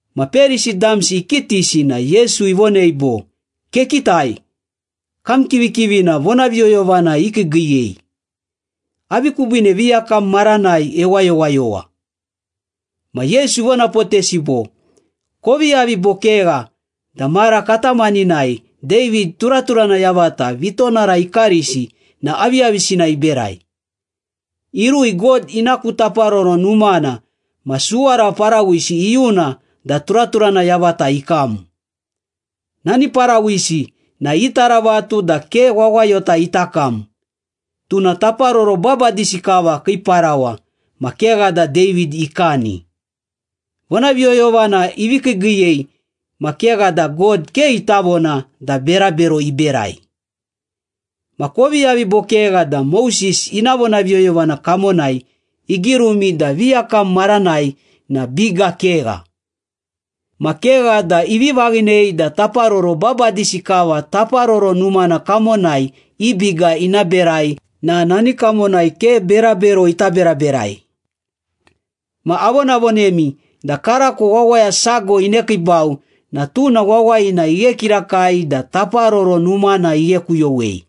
Ma Perisi damsi ikitisi na Yesu ivonei bo, “Kekitai! Kam kivikivina vonaviyoyovana ikiigiiyei. Avi kubiine viyakam maranai ewayowayowa?” Ma Yesu ivonapotesi bo, “Kovi yavi bo kegha da mara katamaninai David turaturana yavata vitonara ikarisi na aviyavisina iberai. Irui God ina ku Taparoro Numana ma suwara parawisi iyuna da turaturana yavata ikam. Nani parawisi na itaravatu da ke wawayota ita kam, tuna taparoro babadisi kava kii parawa ma kegha da David ikani. Vonaviyoyovana ivi kiigiiyei ma kegha da God ke ita vona da berabero iberai. Ma kovi yavi bo kegha da Moses ina vonaviyoyovana kamonai igirumi da viyakam maranai na biga kegha. Ma kegha da ivi vaghinei da taparoro babadisi kava Taparoro Numana kamonai i biga ina berai na nani kamonai ke berabero ita beraberai. Ma avonavonemi da karako wawaya sago inekiibau na tuna wawayina ighe kirakai da Taparoro Numana ighekuyowei.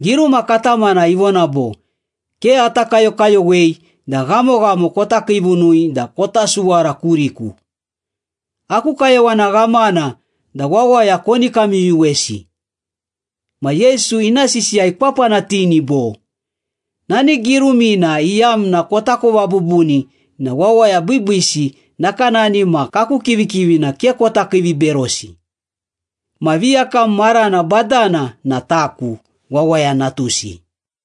Giruma katamana ivona bo, ‘Ke ata kayokayowei da ghamoghamo kota kiivunui da kota suwara kuriku. Aku kayowana ghamana da wawaya koni kamyuyuwesi.’” Ma Yesu ina sisiya ikwapanatini bo, “Nani girumina iyamna kotakova bubuni na wawaya biibiisi nakanani ma kaku kivikivini ke kota kiiviberosi. Ma viyakam marana badana na taku, Wawaya Natusi.”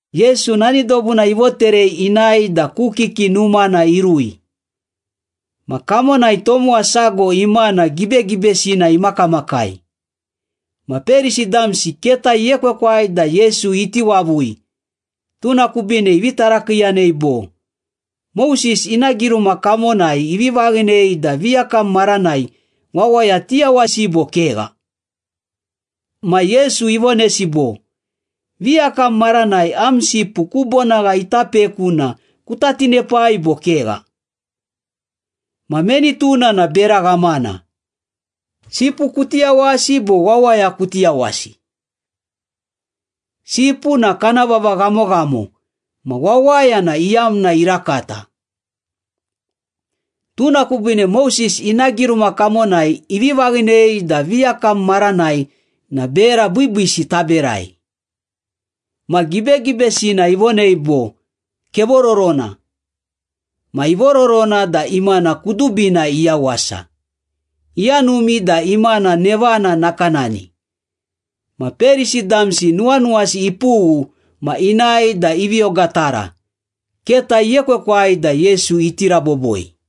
Yesu nani dobuna ivoterei inae da ku kiki numana irui. Ma kamonai tomowa sago imana gibegibesina imakamakai. Ma Perisi damsi keta iekwekwai da Yesu iti wavui, tuna kubiine ivi tarakiiyanei bo, “Moses ina giruma kamonai ivi vaghinei da viyakam maranai wawaya tiyawasi bo kegha?” Ma Yesu ivonesi bo, “Viyakam maranai am sipu ku bonagha ita peku na kuta tinepai bo kegha? Ma meni tuna na bera ghamana, sipu kuti yawasi bo wawaya kuti yawasi? Sipu na kana vava ghamoghamo ma wawaya na iyamna irakata. Tuna kubiine Moses ina giruma kamonai ivi vaghinei da viyakam maranai na bera biibiisi taberai.” Ma gibegibesina ivonei bo, “Kevororona.” Ma ivororona da imana kudubina iyawasa, iyanumi da imana nevana nakanani. Ma Perisi damsi nuwanuwasi ipughu ma inae da ivi ogatara, keta iekwekwai da Yesu iti raboboi.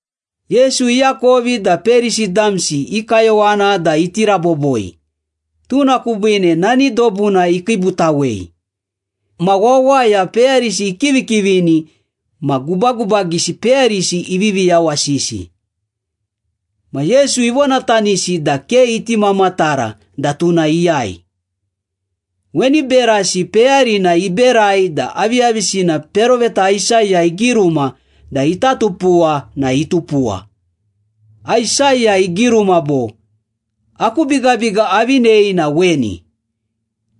Yesu iakovi da Perisi damsi i kayowana da iti raboboi, tuna kubiine nani dobuna ikiibutawei. Ma wawaya peyarisi ikivikivini ma gubagubagisi peyarisi ivivi yawasisi. Ma Yesu ivonatanisi da ke iti mamatara da tuna iyai. Weni berasi peyarina iberai da aviyavisina peroveta Aisaya igiruma da ita tupuwa na itupuwa. Aisaya igiruma bo, “Aku bigabiga avinei na weni,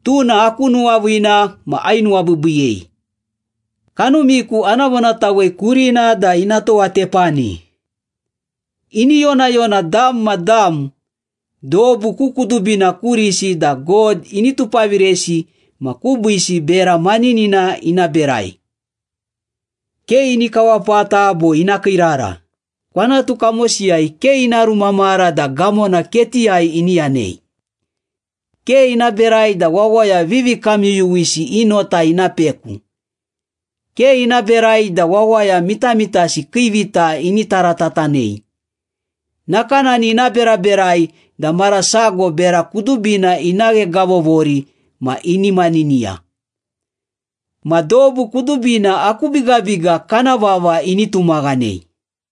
tuna aku nuwaviina ma ainuwabiibiiyei. Kanumiku ana vonatawei kurina da ina towatepani, Ini yonayona dam ma dam dobu ku kudubina kurisi da God ini tupaviresi ma kubiisi bera maninina ina berai. Ke ini kawapata bo ina kiirara, Kwanatu kamosiyai ke ina rumamara da gamona ketiyai ini yanei. Ke ina berai da wawaya vivikamyuyuwisi i nota ina peku, Ke ina berai da wawaya mitamitasi kii vita ini taratatanei. Nakanani ina beraberai da mara sago bera kudubina ina ghegavovori ma ini maniniya. Ma dobu kudubina aku bigabiga kana vava ini tumaghanei.”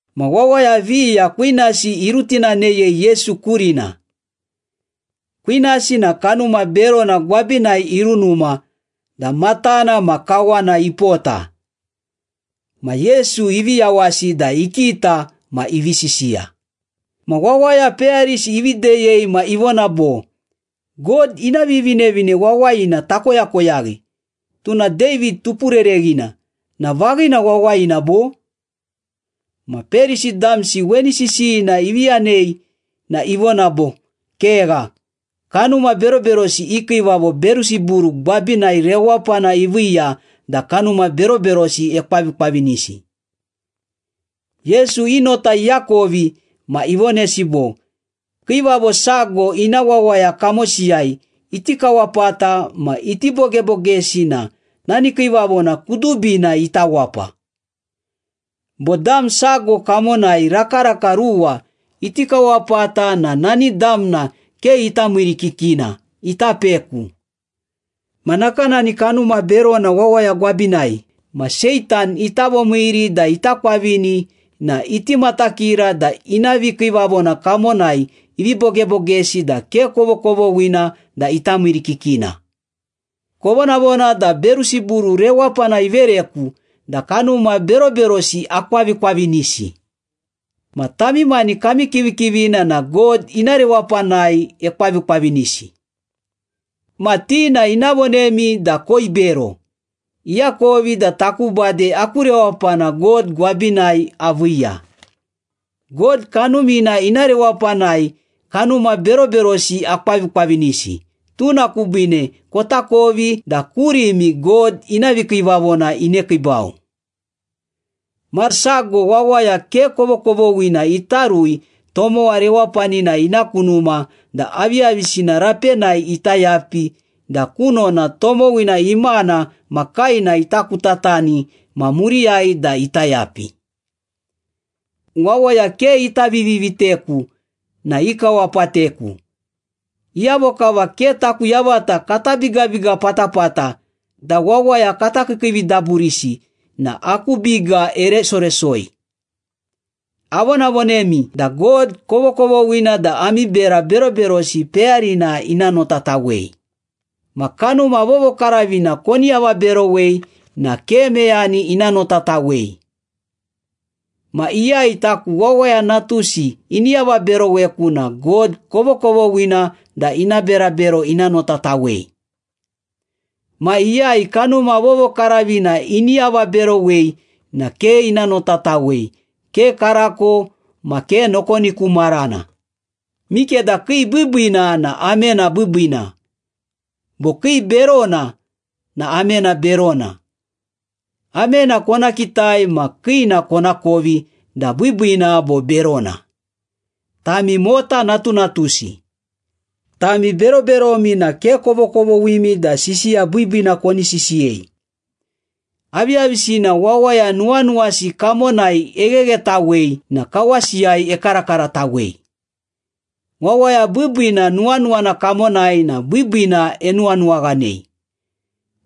Ma wawaya viya kwinasi irutinaneyei Yesu kurina. Kwinasi na kanuma berona gwabinai irunuma da matana ma kawana ipota. Ma Yesu ivi yawasi da ikita ma ivi sisiya. Ma wawaya peyarisi ivi deyei ma ivona bo, “God ina Vivinevine Wawayina takoyakoyaghi, tuna David tupurereghina na vaghina wawayina, bo?” Ma Perisi damsi weni sisiyina ivi yanei na ivona bo, “Kegha! Kanuma beroberosi i kiivavo Berusiburu gwabinai rewapana iviiya da kanuma beroberosi ekwavikwavinisi.” Yesu i nota iakovi ma ivonesi bo, “Kiivavo sago ina wawaya kamosiyai iti kawapata ma iti bogebogesi na nani kiivavona kudubina ita wapa. Bo dam sago kamonai rakaraka ruwa iti kawapata na nani damna ke ita miirikikina, ita peku. Ma nakanani kanuma berona wawaya gwabinai ma Seitan ita vomiiri da ita kwavini na iti matakira da ina vikiivavona kamonai ivi bogebogesi da ke kovokovoghina da ita miirikikina. Kovonavona da Berusiburu rewapana ivereku da kanuma beroberosi akwavikwavinisi. Ma tami mani kami kivikivina na God ina rewapanai ekwavikwavinisi. Ma ti na ina vonemi da koibero, iakovi da taku bade aku rewapana God gwabinai aviiya.” “God Kanumina ina rewapanai kanuma beroberosi akwavikwavinisi, tuna kubiine kotakovi da kurimi God ina vikiivavona inekiibau.” “Ma sago, wawaya ke kovokovoghina ita rui tomowa rewapanina ina ku numa da aviyavisina rapenai ita yapi da kunona tomowina imana ma kaena ita kutatani ma muriyai da ita yapi.” “Wawaya ke ita viviteku na ikawapateku. Iyavo kava ke taku yavata kata bigabiga patapata da wawaya kata kiikiividaburisi na aku biga eresoresoi. Avonavonemi da God kovokovoghina da ami bera beroberosi peyarina ina notatawei. Ma Kanuma Vovokaravina koni avaberowei na ke meyani ina notatawei. Ma iyai taku Wawaya Natusi ini avaberoweku na God kovokovoghina da ina berabero ina notatawei. Ma iyai Kanuma Vovokaravina ini avaberowei na ke ina notatawei, ke karako ma ke nokoni ku marana.” “Mikeda kii biibiina na amena biibiina, bo kii berona na amena berona. Amena kona kitai ma kiina konakovi da biibiina bo berona. Tami mota natunatusi! Tami beroberomi na ke kovokovoghimi da sisiya biibiina koni sisiyei. Aviyavisina wawaya nuwanuwasi kamonai egheghetawei na kawasiyai ekarakaratawei. Wawaya biibiina nuwanuwana kamonai na biibiina enuwanuwaghanei.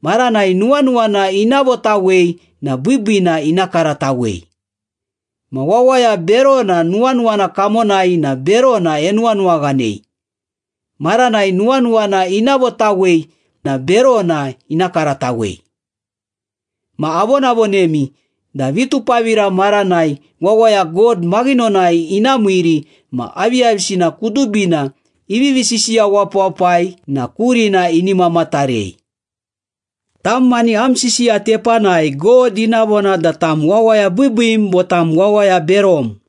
Maranai nuwanuwana ina votawei na biibiina ina karatawei. Ma wawaya berona nuwanuwana kamonai na berona enuwanuwaghanei. Maranai nuwanuwana ina votawei na berona ina karatawei. Ma avonavonemi da vitupavira maranai wawaya God maghinonai ina miiri ma aviyavisina kudubina ivivi sisiya wapawapai na kurina ini mamatarei. Tam mani am sisiya tepanai God ina vona da tam wawaya biibiim bo tam wawaya berom.”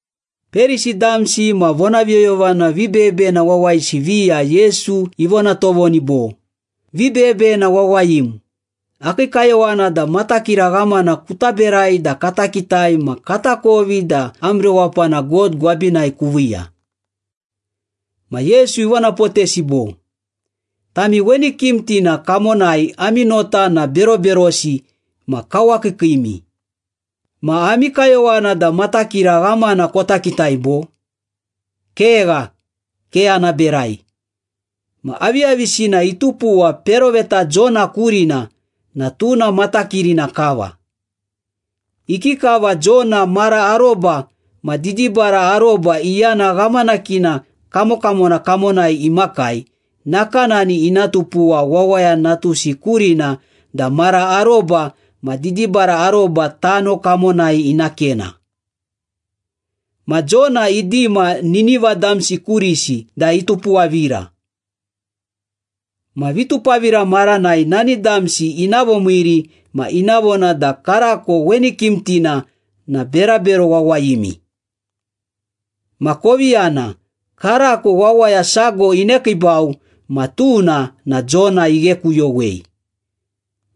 Perisi damsi ma vonaviyoyovana vibeyebeyena wawayisi viya Yesu ivona tovoni bo, “Vibeyebeyena wawayim, akii kayowana da matakira ghamana kuta berai da kata kitai ma katakovi da am rewapana God gwabinai kuviiya.” Ma Yesu ivonapotesi bo, “Tami weni kimtina kamonai ami nota na beroberosi ma kawakiikiimi. Ma ami kayowana da matakira ghamana kota kitai, bo? Kegha, ke ana berai. Ma aviyavisina itupuwa peroveta Jona kurina na tuna matakirina kava. Ikikava Jona mara aroba ma didibara aroba iyana ghamanakina kamokamona kamonai imakai, nakanani ina tupuwa Wawaya Natusi kurina da mara aroba ma didibara aroba tano kamonai ina kena. Ma Jona idima Nineva damsi kurisi da itupuwavira. Ma vitupavira maranai nani damsi ina vomiiri ma ina vona da karako weni kimtina na berabero wawayimi. Ma kovi yana, karako wawaya sago inekiibau ma tuna na Jona ighekuyowei.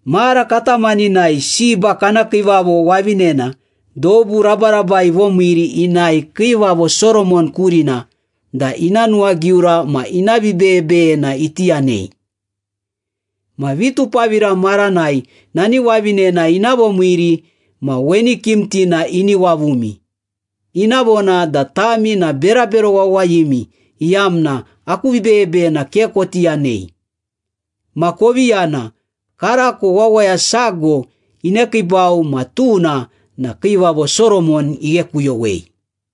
Mara katamaninai Seba kana kiivavo wavinena dobu rabarabai ivomiiri inae Kiivavo Soromon kurina da ina nuwagiura ma ina vibeyebeyena iti yanei. Ma vitupavira maranai nani wavinena ina vomiiri ma weni kimtina ini wavumi, ina vona da tami na berabero wawayimi iyamna aku vibeyebeyena ke koti yanei. Ma kovi yana, karako wawaya sago inekiibau ma tuna na Kiivavo Soromon ighekuyowei.”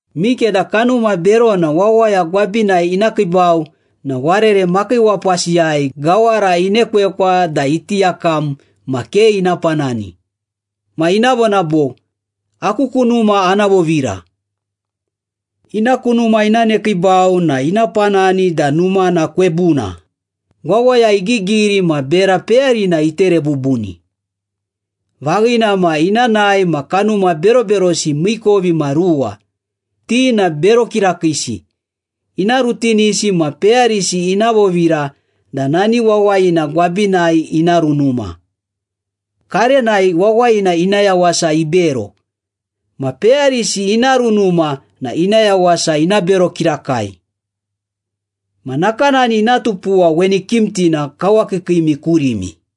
“Mikeda kanuma berona wawaya gwabinai ina kiibau na warere makiiwapasiyai gawara inekwekwa da iti yakam ma ke ina panani. Ma ina vona bo, ‘Aku ku numa ana vovira.’ Ina ku numa ina nekiibau na ina panani da numana kwebuna, wawaya igigiri ma bera peyarina itere bubuni. Vaghina ma ina nae ma kanuma beroberosi miikovimaruwa, ti na bero kirakiisi, ina rutinisi ma peyarisi ina vovira da nani wawayina gwabinai ina runuma. Karenai wawayina ina yawasa ibero. Ma peyarisi ina runuma na ina yawasa ina bero kirakai. Ma nakanani ina tupuwa weni kimtina kawakiikiimi kurimi.”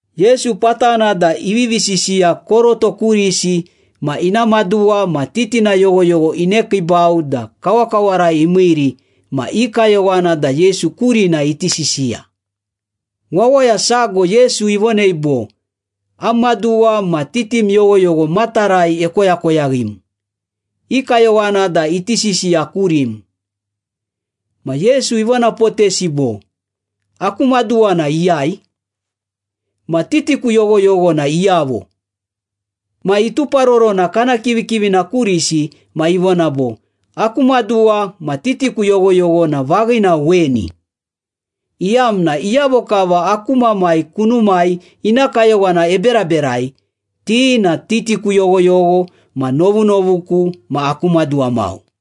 Yesu patana da ivivi sisiya koroto kurisi ma ina maduwa ma titina yoghoyogho inekiibau da kawakawarai imiiri ma i kayowana da Yesu kurina iti sisiya. Wawaya sago Yesu ivonei bo, “Am maduwa ma titim yoghoyogho matarai ekoyakoyaghim, i kayowana da iti sisiya kurim.” Ma Yesu ivonapotesi bo, “Aku maduwa na iyai? Ma titiku yoghoyogho na iyavo?” Ma ituparorona kana kivikivina kurisi ma ivona bo, “Aku maduwa ma titiku yoghoyogho na vaghina weni, iyamna iyavo kava aku Mamai kunumai ina kayowana eberaberai, ti na titiku yoghoyogho ma novunovuku ma aku maduwa mau.”